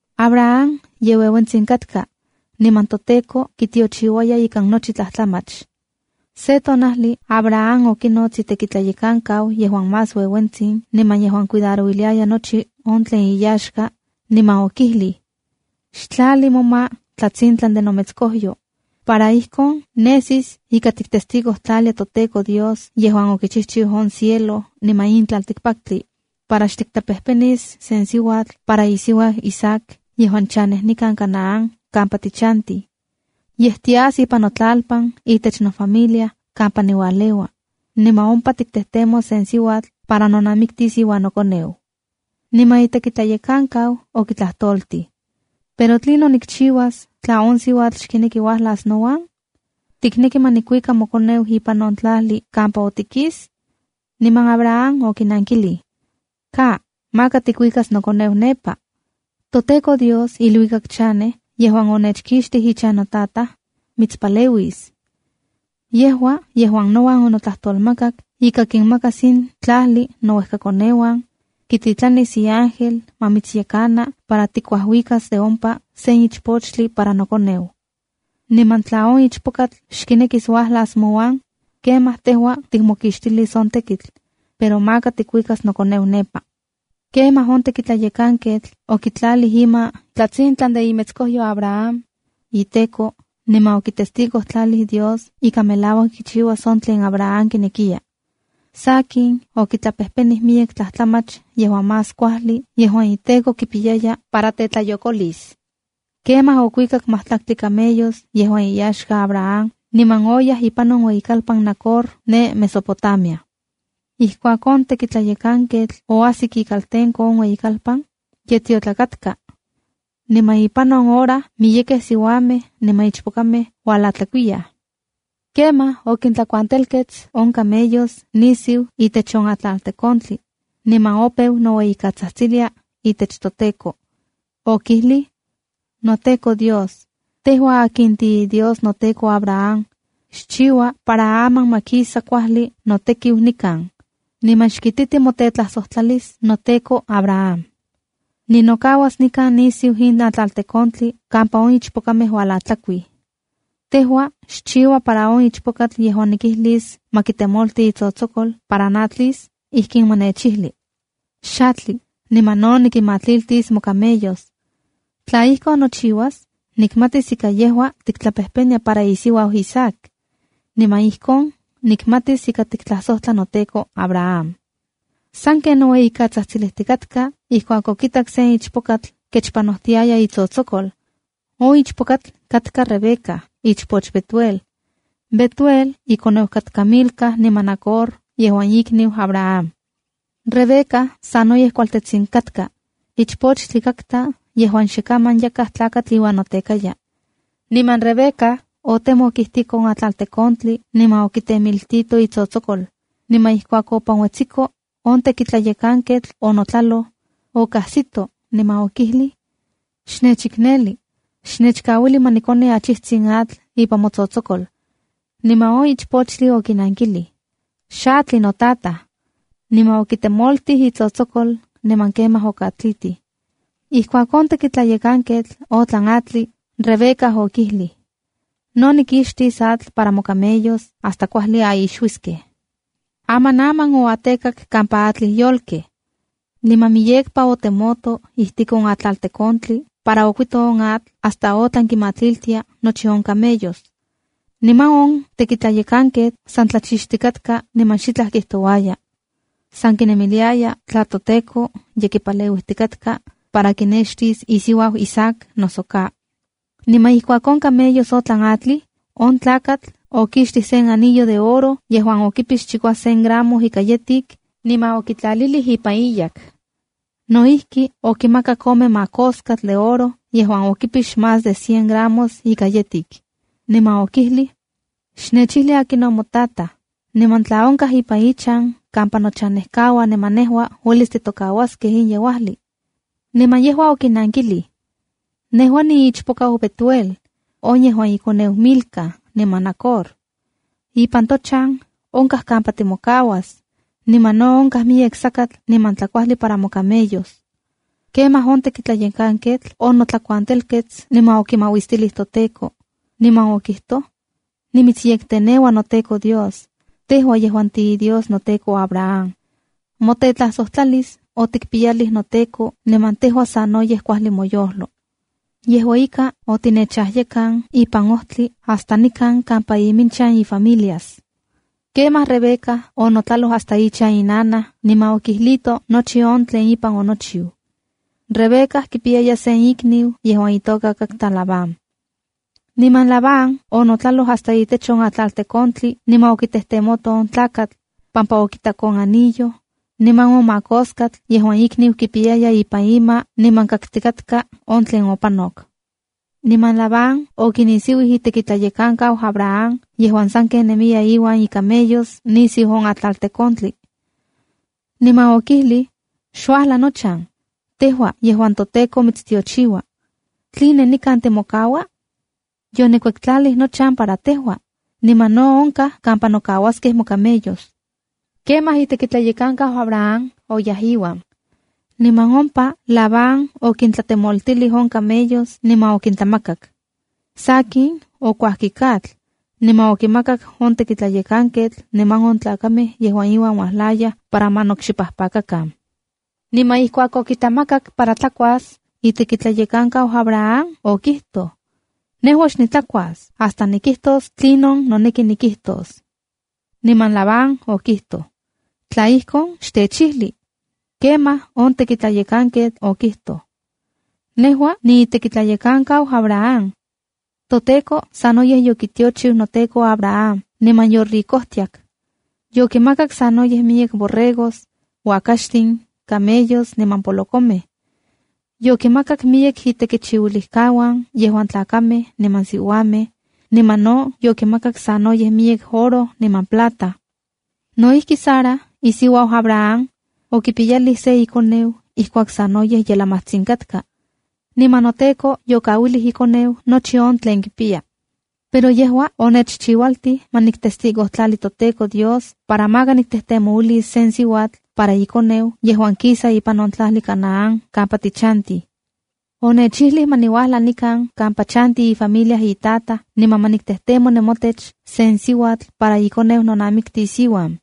Abraham ye ueuentsin katka, niman toTEKO kitiochiuaya ikan nochi tlajtlamach. Se tonajli Abraham okinots itekitlayekankau yejuan más ueuentsin niman yejuan cuidarouiliaya nochi on tlen iyaxka, niman okijlij: —Xtlali moma tlatsintlan de nometskojyo, para ijkon nesis ika tiktestigojtlalia toTEKO Dios yejuan okichijchiu on cielo niman on tlaltikpaktli, para xtiktlapejpenis sen siuatl para isiuau Isaac yejuan chanej nikan Canaán kampa tichantij. Yej tias notlalpan itech nofamilia kampa niualeua, niman ompa tiktejtemos sen siuatl para nonamitis iuan nokoneu. Niman itekitlayekankau okitlajtoltij: —Pero ¿tlinon nikchiuas tla on siuatl xkineki uajlas nouan? ¿Tikneki ma nikuika mokoneu ipan on tlajli kampa otikis? Niman Abraham okinankilij: —¡Ka, maka tikuikas nokoneu nepa! ToTEKO Dios iluikak chanej yejuan onechkixtij ichan notataj, mitspaleuis. Yejua yejuan nouan onotlajtolmakak ika kinmakas in tlajli nouejkakoneuan, kititlanis iángel ma mitsyekana para tikuajuikas de ompa sen ichpochtli para nokoneu. Niman tla on ichpokatl xkinekis uajlas mouan, kemaj tejua tikmokixtilis on tekitl, pero maka tikuikas nokoneu nepa. Kemaj on tekitlayekanketl okitlalij ima tlatsintlan de imetskojyo Abraham, iTEKO, niman okitestigojtlalij Dios ika melauak kichiuas on tlen Abraham kinekiya. Sakin, okitlapejpenij miyek tlajtlamach yejuan más kuajli yejuan iTEKO kipiyaya para tetlayokolis. Kemaj okuikak majtlaktli camellos yejuan iyaxka Abraham niman oyaj ipan on iueyikalpan Nacor ne Mesopotamia. Ijkuak on tekitlayekanketl oajsik ikaltenko on ueyikalpan, ye tiotlak katka. Niman ipan on hora miyekej siuamej niman ichpokamej ualatlakuiyaj. Kemaj okintlakuantelkets on camellos nisiu itech sen atlaltekontli, niman opeu noueyikatsajtsilia itech toTEKO. Okijlij: “NoTEKO Dios, tejua akin tiiDios noteko Abraham, xchiua para aman ma kisa kuajli notekiu nikan, niman xkititi motetlajsojtlalis noteko Abraham. Ninokauas nikan nisiu in atlaltekontli kampa on ichpokamej ualatlakuij. Tejua xchiua para on ichpokatl yejuan nikijlis ma kitemolti itsotsokol para natlis, ijkin ma nechnankili: ‘Xatli, niman no nikinmatliltis mocamellos.’ Tla ijkon nochiuas, nikmatis ika yejua tiktlapejpenia para isiuau Isaac. Niman ijkon nikmatis ika tiktlajsojtla noteko, Abraham.” Sanken noueyikatsajtsilijtikatk ijkuak okitak sen ichpokatl kechpanojtiaya itsotsokol. On ichpokatl katka Rebeca, ichpoch Betuel. Betuel ikoneu katka Milca niman Nacor yejuan ikniu Abraham. Rebeca sanoyej kualtetsin katka, ichpochtli katka yejuan xe kaman yakaj tlakatl iuan notekaya. Niman Rebeca otemok ijtik on atlaltekontli niman okitemiltito itsotsokol, niman ijkuak yopanuetsiko, on tekitlayekanketl onotlaloj, okajsito, niman okijlij: —Xnechikneli, xnechkauili ma nikoni achijtsin atl ipan motsotsokol. Niman on ichpochtli okinankilij: —Xatli, notataj. Niman okitemoltij itsotsokol niman kemaj okatlitij. Ijkuak on tekitlayekanketl otlan atli, Rebeca okijlij: —No nikixtis atl para mocamellos hasta kuajli aixuiskej. Amanaman oatekak kampa atlij yolkej. Niman miyekpa otemoto ijtik on atlaltekontli para okuito on atl hasta otlan kinmatlitia nochi on camellos. Niman on tekitlayekanketl san tlachixtikatka niman xitlaj kijtouaya. San kinemiliaya tla toTEKO ye kipaleuitikatka para kinextis isiuau Isaac noso ka. Niman ijkuak on camellos otlan atlij, on tlakatl okixtij sen anillo de oro yejuan okipix chikuasen gramo ika yetik, niman okitlalilij ipan iyak. No ijki, okimakak ome makoskatl de oro yejuan okipix más de cien gramos ika yetik, niman okijlij: —Xnechijli akinon motataj, niman tla onkaj ipan ichan kampa nochanejkauan niman nejua uelis titokauaskej in yeuajli. Niman yejua okinankilij: —Nejua niichpokau Betuel, on yejuan ikoneu Milca niman Nacor. Ipan tochan onkaj kampa timokauas, niman no onkaj miyek sakatl niman tlakuajli para mocamellos. Kemaj on tekitlayekanketl onotlakuantelkets niman okimauistilij toTEKO, niman okijtoj: “Nimitsyekteneua noTEKO Dios, tejua yejuan tiiDios noteko Abraham. Motetlasojtlalis otikpiyalij noteko niman tejua sanoyej kuajli moyojlo. Yejua ika, otinechajyekan ipan ojtli hasta nikan kampa iminchan ifamilias.” Kemaj Rebeca onotlaloj hasta ichan inanaj niman okijlito nochi on tlen ipan onochiu. Rebeca kipiyaya sen ikniu yejuan itoka Labán. Niman Labán onotlaloj hasta itech on atlaltekontli para okitejtemoto on tlakatl, pampa okitak on anillo, niman on makoskatl yejuan ikniu kipiyaya ipan ima niman kaktikatka on tlen opanok. Niman Labán okinisiuij itekitlayekankau Abraham yejuan saken nemiya iuan icamellos nisiu on atlaltekontli. Niman okijlij: —Xuajla nochan, tejua yejuan toTEKO mitstiochiua. ¿Tline nikan timokaua? Yonikuektlalij nochan para tejua, niman no onkaj kampa nokauaskej mocamellos. Kemaj itekitlayekankau Abraham oyaj iuan. Niman ompa Labán okintlatemoltilij on camellos niman okintlamakak. Sakin, okuajkik atl, niman okimakak on tekitlayekanketl niman on tlakamej yejuan iuan uajlayaj para ma nokxipajpakakan. Niman ijkuak okitlamakak para tlakuas, itekitlayekankau Abraham okijtoj: —Nejua xnitlakuas hasta nikijtos tlinon noneki nikijtos. Niman Labán okijtoj: —Tla ijkon, xtechijli. Kemaj on tekitlayekanketl okijtoj: —Nejua niitekitlayekankau Abraham. ToTEKO sanoyej yokitiochiu noteko Abraham niman yoricojtiak. Yokimakak sanoyej miyek borregos, uakaxtin, camellos niman polokomej. Yokimakak miyek itekichiuilijkauan yejuan tlakamej niman siuamej, niman no yokimakak sanoyej miyek oro niman plata. No ijki, Sara, isiuau Abraham, okipiyalij se ikoneu ijkuak sanoyej ye lamajtsin katka. Niman noteko yokauilij ikoneu nochi on tlen kipiya. Pero yejua onechchiualtij ma niktestigojtlali toTEKO Dios para maka niktejtemouilis se siuatl para ikoneu yejuan kisa ipan on tlajli Canaán kampa tichantij. Onechijli ma niuajla nikan kampa chantij ifamilia itataj niman ma niktejtemo nemotech sen siuatl para ikoneu nonamiktis iuan.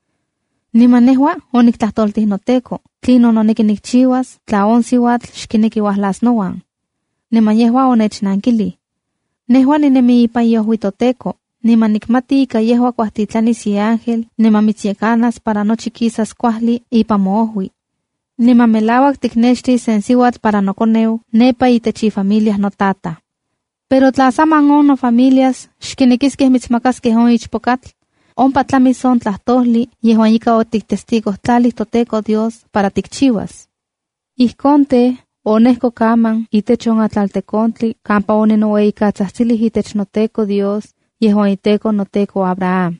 Niman nejua oniktlajtoltij noteko tlinon noneki nikchiuas tla on siuatl xkineki uajlas nouan. Niman yejua onechnankilij: “Nejua ninemi ipan iojui toTEKO, niman nikmati ika yejua kuajtitlanis iángel niman mitsyekanas para nochi kisas kuajli ipan moojui. Niman melauak tiknextis sen siuatl para nokoneu nepa itech ifamilia notataj. Pero tla saman on nofamilia xkinekiskej mitsmakaskej on ichpokatl, ompa tlamis on tlajtojlij yejuan ika otiktestigojtlalij toTEKO Dios para tikchiuas.” ’Ijkon tej, onejkok aman itech on atlaltekontli kampa oninoueyikatsajtsilij itech toTEKO Dios, yejuan iTEKO noteko Abraham.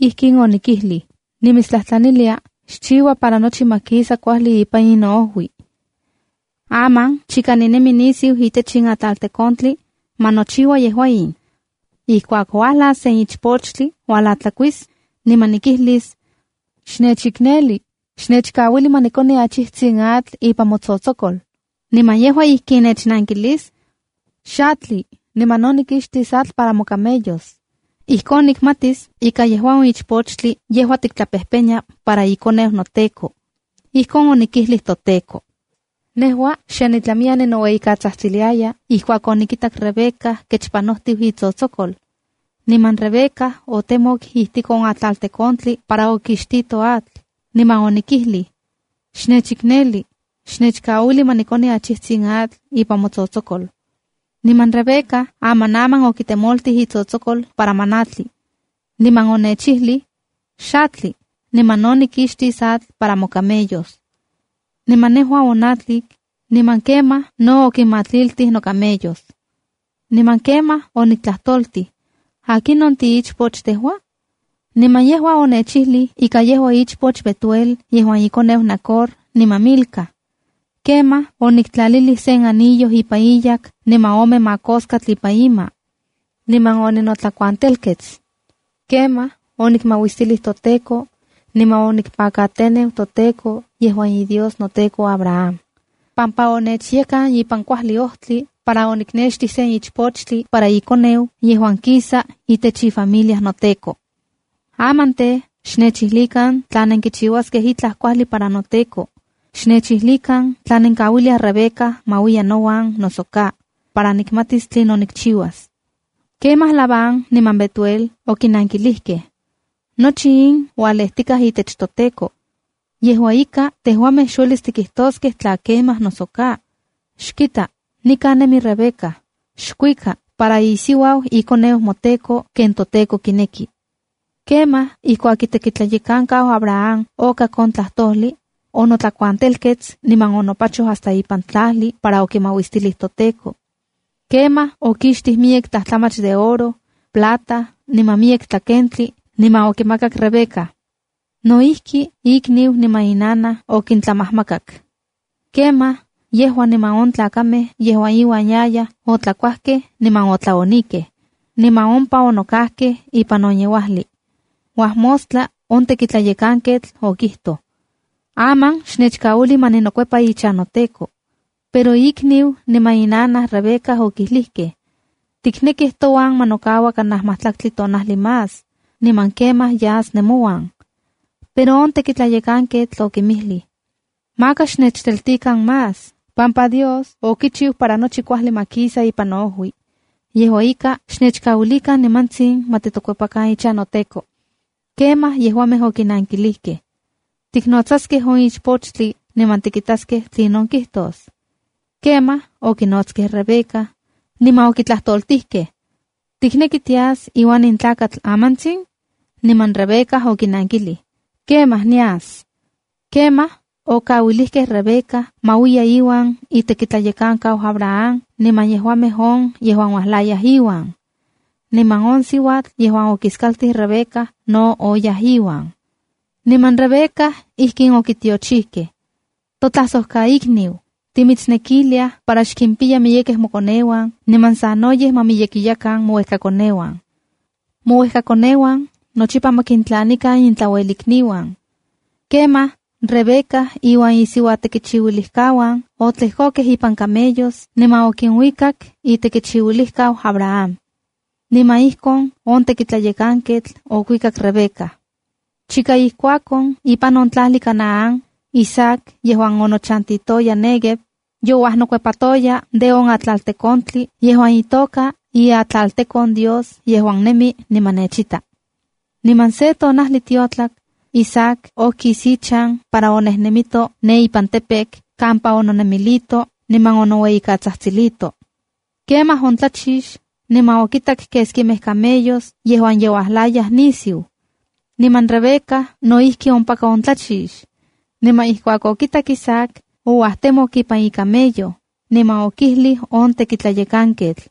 Ijkin onikijlij: ‘Nimitstlajtlanilia xchiua para nochi ma kisa kuajli ipan in noojui. Aman chika ninemi nisiu itech in atlaltekontli, ma nochiua yejua in: Ijkuak uajlas sen ichpochtli ualatlakuis, niman nikijlis: Xnechikneli, xnechkauili ma nikoni achijtsin atl ipan motsotsokol. Niman yejua ijkin nechnankilis: Xatli, niman no nikixtis atl para mocamellos. Ijkon nikmatis ika yejua on ichpochtli yejuan tiktlapejpenia para ikoneu noteko.’ Ijkon onikijlij toTEKO. ’Nejua xe nitlamiya ninoueyikatsajtsilia ijkuak onikitak Rebeca kechpanojtiu itsotsokol. Niman Rebeca otemok ijtik on atlaltekontli para okixtitoj atl, niman onikijlij: ‘Xnechikneli, xnechkauili ma nikoni achijtsin atl ipan motsotsokol.’ Niman Rebeca amanaman okitemoltij itsotsokol para ma natli, niman onechijli: ‘Xatli, niman no nikixtis atl para mocamellos.’ Niman nejua onatlik, niman kemaj no okinmatliltij nocamellos. Niman kemaj oniktlajtoltij: ‘¿Akinon tiichpoch tejua?’ Niman yejua onechijli ika yejua ichpoch Betuel yejuan ikoneu Nacor niman Milca. Kemaj oniktlaliltij sen anillo ipan iyak niman ome makoskatl ipan ima. Niman oninotlakuantelkets. Kemaj onikmauistilij toTEKO, niman onikpakateneu toTEKO, yejuan iDios noteko Abraham, pampa onechyekan ipan kuajli ojtli para oniknextij sen ichpochtli para ikoneu yejuan kisa itech ifamilia noteko. Aman tej, xnechijlikan tla nenkichiuaskej itlaj kuajli para noteko, xnechijlikan tla nenkauiliaj Rebeca ma uiya nouan noso ka, para nikmatis tlinon nikchiuas.” Kemaj Labán niman Betuel okinankilijkej: —Nochi in ualejtikaj itech toTEKO. Yejua ika, tejuamej xuelis tikijtoskej tla kemaj noso ka. Xkita, nikan nemi Rebeca. Xkuika, para isiuau ikoneu moteko ken toTEKO kineki. Kemaj ijkuak itekitlayekankau Abraham okak on tlajtojli, onotlakuantelkets niman onopachoj hasta ipan tlajli para okimauistilij toTEKO. Kemaj okixtij miyek tlajtlamach de oro, plata, niman miyek tlakentli, niman okimakak Rebeca. No ijki, ikniu niman inanaj okintlamajmakak. Kemaj, yejua niman on tlakamej yejuan iuan yayaj otlakuajkej niman otlaonikej, niman ompa onokajkej ipan on yeuajli. Uajmostla on tekitlayekanketl okijtoj: —Aman xnechkauili ma ninokuepa ichan noteko. Pero ikniu niman inanaj Rebeca okijlijkej: —Tiknekij touan ma nokaua kanaj majtlaktli tonajli más, niman kemaj yas nemouan. Pero on tekitlayekanketl okinmijlij: —Maka xnechteltikan más, pampa Dios okichiu para nochi kuajli ma kisa ipan noojui. Yejua ika, xtechkauilikan nimantsin ma titokuepan ichan noteko. Kemaj yejuamej okinankilijkej: —Tiknotsaskej on ichpochtli, niman tikitaskej tlinon kijtos. Kemaj, okinotskej Rebeca, niman okitlajtoltijkej: —¿Tikneki tias iuan in tlakatl amantsin? Niman Rebeca okinnankilij: —Kemaj, nias. Kemaj, okikauilijkej Rebeca ma uiya iuan itekitlayekankau Abraham niman yejuamej on yejuan uajlayaj iuan. Niman on siuatl yejuan okiskaltij Rebeca no oyaj iuan. Niman Rebeca ijkin okitiochijkej: “Totlajsojkaikniu, ¡timitsnekiliaj para xkimpiya miyekej mokoneuan, niman sanoyej ma miyekiyakan mouejkakoneuan! ¡Mouejkakoneuan nochipa ma kintlanikan intlauelikniuan!” Kemaj, Rebeca iuan isiuatekichiuilijkauan otlejkokej ipan camellos niman okinkuikak itekitlayekankau Abraham. Niman ijkon on tekitlayekanketl okuikak Rebeca. Chika ijkuak on, ipan on tlajli Canaán, Isaac yejuan onochantitoya Néguev, youajnokuepatoya de on atlaltekontli yejuan itoka “Iatlaltekon Dios yejuan nemi niman nechita”. Niman se tonajli tiotlak, Isaac okis ichan para onejnemito ne ipan campo campa ononemilito niman onoueyikatsajtsilito. Kemaj ontlachix, niman okitak keskimej camellos yejuan ye uajlayaj nisiu. Niman Rebeca no ijki ompaka ontlachix. Niman ijkuak okitak Isaac, ouajtemok ipan icamello, niman okijlij on tekitlayekanketl: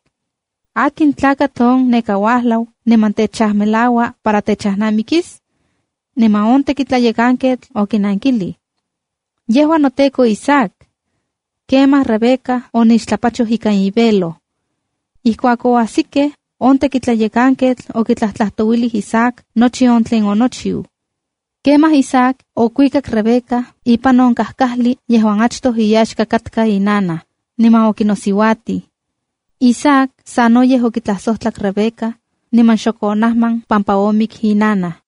—¿Akin tlakatl on neka uajlau niman techajmelaua para techajnamikis? Niman on tekitlayekanketl okinankilij: —Yejua noteko Isaac. Kemaj Rebeca onixtlapachoj ikan ivelo. Ijkuak oajsikej, on tekitlayekanketl okitlajtlajtouilij Isaac nochi on tlen okichiu. Kemaj Isaac okuikak Rebeca ipan on kajkajli yejuan achtoj iyaxka katka inanaj, niman okinosiuatij. Isaac sanoyej okitlajsojtlak Rebeca, niman xok onajman pampa omik inanaj.